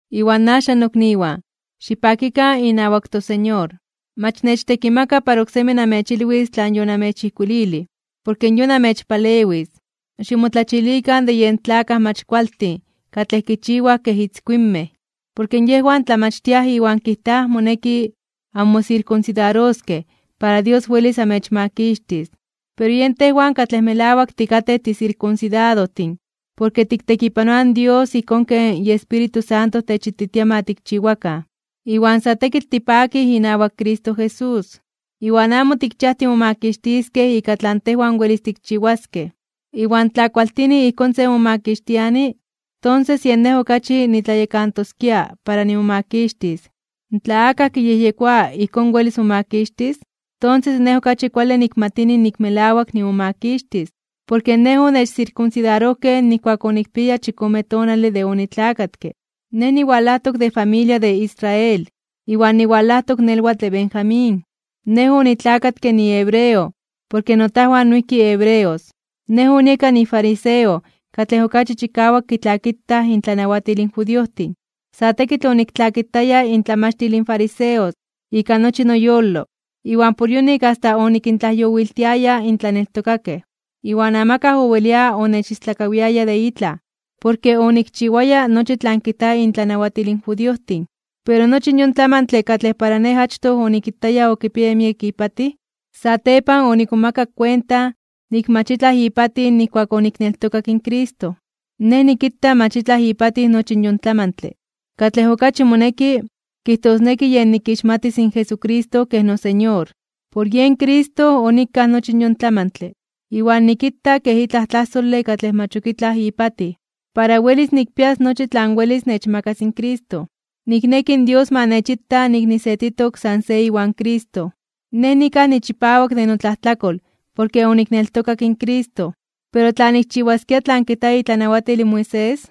Iwan axan nokniwan, xipakikan inawak toSeñor. Mach nechtekimaka para oksemi namechilwis tlan yonamechijkuililij, porke yon amechpalewis. Ximotlachilikan de yen tlakaj mach kualtin katlej kichiwaj kej itzkuinmej. Porke yejwan tlamachtiaj iwan kijtaj moneki anmosirkunsidaroskej para Dios welis amechmakixtis. Pero yen tejwan katlej melawak tikatej tisirkunsidadojtin porke tiktekipanoaj in Dios ijkón ken Espíritu Santo techititia ma tikchiwakan. Iwan sa tekitl tipakij inawak Cristo Jesús, iwan amo tikchiaj timomakixtiskej ika tlan tejwan welis tikchiwaskej. Iwan tla kualtini ijkón se momakixtiani, tonses yen nej okachi nitlayekantoskia para nimomakixtis. Tla akaj kiyejyekoa ijkón welis momakixtis, tonses nej okachi kuale nikmatini nik melawak nimomakixtis. Porke nej onechsirkunsidarojkej nijkuak onikpiaya chikome tonale de onitlakatke. Nej niwalajtok de familia de Israel, iwan niwalajtok nelwatl de Benjamín. Nej onitlakatke nihebreo porke notajwan noijki hebreos. Nej onieka nifariseo katlej okachi chikawak kitlakitaj intlanawatil in judiojtin. Sa tekitl oniktlakitaya intlamachtil in fariseos ika nochi noyolo iwan por yonik asta onikintlajyowiltiaya in tlaneltokakej. Iwan amakaj owelia onechistlakawiaya de itlaj, porke onikchiwaya nochi tlan kijta intlanawatil in judiojtin. Pero nochi yon tlamantle katlej para nej achtoj onikitaya okipiaya miek ipatij, satepan onikmomakak kuenta nik mach itlaj ipatij nijkuak onikneltokak in Cristo. Nej nikita mach itlaj ipatij nochi yon tlamantle. Katlej okachi moneki kijtosneki yen nikixmatis in Jesucristo kej noSeñor. Por yen Cristo onikaj nochi yon tlamantle iwan nikita kej itlaj tlajsole katlej mach ok itlaj ipatij, para welis nikpias nochi tlan welis nechmakas in Cristo. Nikneki in Dios ma nechita nik nisetitok san se iwan Cristo. Nej nikaj nichipawak de notlajtlakol porke onikneltokak in Cristo. Pero tla nikchiwaskia tlan kijta itlanawatil in Moisés,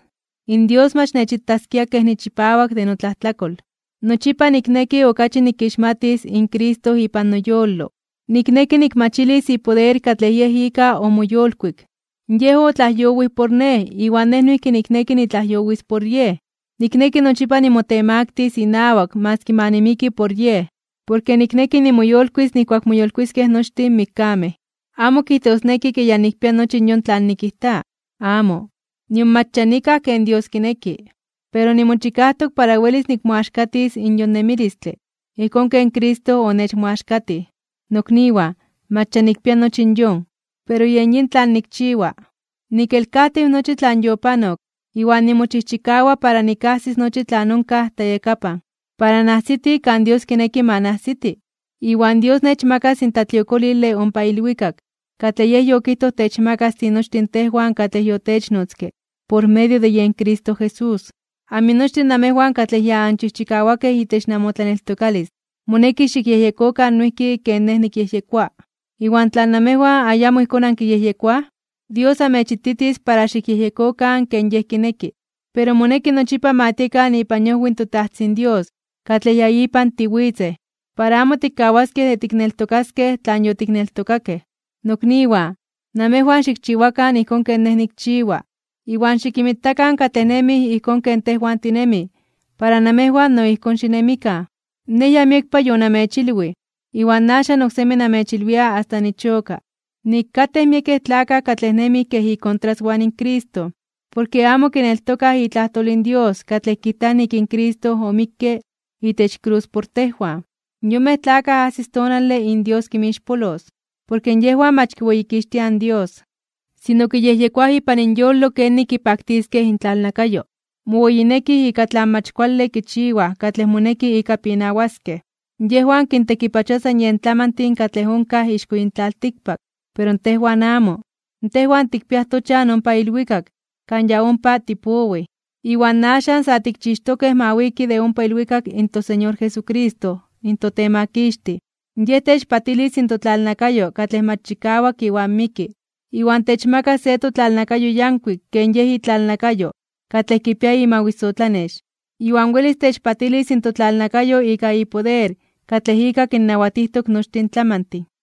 in Dios mach nechitaskia kej nichipawak de notlajtlakol. Nochipa nikneki okachi nikixmatis in Cristo ipan noyolo. Nikneki nikmachilis ipoder katlej ika omoyolkuik. Yej otlajyowij por nej iwan nej noijki nikneki nitlajyowis por Yej. Nikneki nochipa nimotemaktis (nimotemaktilis) inawak maski ma nimiki por Yej, porke nikneki nimoyolkuis (nimoyolitis) nijkuak moyolkuiskej nochtin mikkamej. Amo kijtosneki ke ya nikpia nochi yon tlan nikijta. ¡Amo! Nion mach ya nikaj ken Dios kineki. Pero nimochikajtok para welis nikmoaxkatis in yon nemilistle, ijkón ken Cristo onechmoaxkatij. Nokniwan, mach ya nikpia nochi yon. Pero nikchiwa de nikelkajtiw nochi tlan yopanok iwan nimochijchikawa para nikajsis nochi tlan onkaj tlayakapan, para najsiti kan Dios kineki ma najsiti. Iwan Dios nechmakas in tlatliokolile ompa ilwikak katlej Yej yokijtoj techmakas tinochtin tejwan katlej yotechnotzke por medio de Cristo Jesús. Aminochtin namejwan katlej ya anchijchikawakej itech namotlaneltokalis moneki xikyejyekokan noijki ken nej nikyejyekoa. Iwan tla namejwan ayamo ijkón ankiyejyekoaj, Dios amechititis para xikyejyekokan ken Yej kineki. Pero moneki nochipa ma tiekan ipan iojwi in toTajtzin Dios katlej ya ipan tiwitzej, para amo tikkawaskej de tikneltokaskej tlan yotikneltokakej. Nokniwan, namejwan xikchiwakan ijkón ken nej nikchiwa. Iwan xikinmitakan katlej nemij ijkón ken tejwan tinemij para namejwan no ijkón xinemikan. Nej ya miekpa yonamechilwij, iwan axan oksemi namechilwia asta nichoka, nik katej miekej tlakaj katlej nemij kej ikontraswan in Cristo porke amo kineltokaj itlajtol in Dios katlej kijta nik in Cristo omikke itech krus por tejwan. Yonmej tlakaj ajsis tonale in Dios kinmixpolos. Porke yejwan mach kiweyikixtiaj in Dios, sino kiyejyekoaj ipan inyolo kenik kipaktiskej intlalnakayo. Moweyinekij ika tlan mach kuale kichiwaj katlej moneki ika pinawaskej. Yejwan kintekipachoa san yen tlamantin katlej onkaj ixko yin tlaltikpak. Pero tejwan amo, tejwan tikpiaj tochan ompa ilwikak kan ya ompa tipowij. Iwan axan sa tikchixtokej ma wiki de ompa ilwikak in toSeñor Jesucristo in toTemakixtij. Yej techpatilis in totlalnakayo katlej mach chikawak iwan miki, iwan techmakas se totlalnakayo yankuik ken Yej itlalnakayo katlej kipia imawisotlanex. Iwan welis techpatilis totlalnakayo ika ipoder katlej ika kinnawatijtok nochtin tlamantin.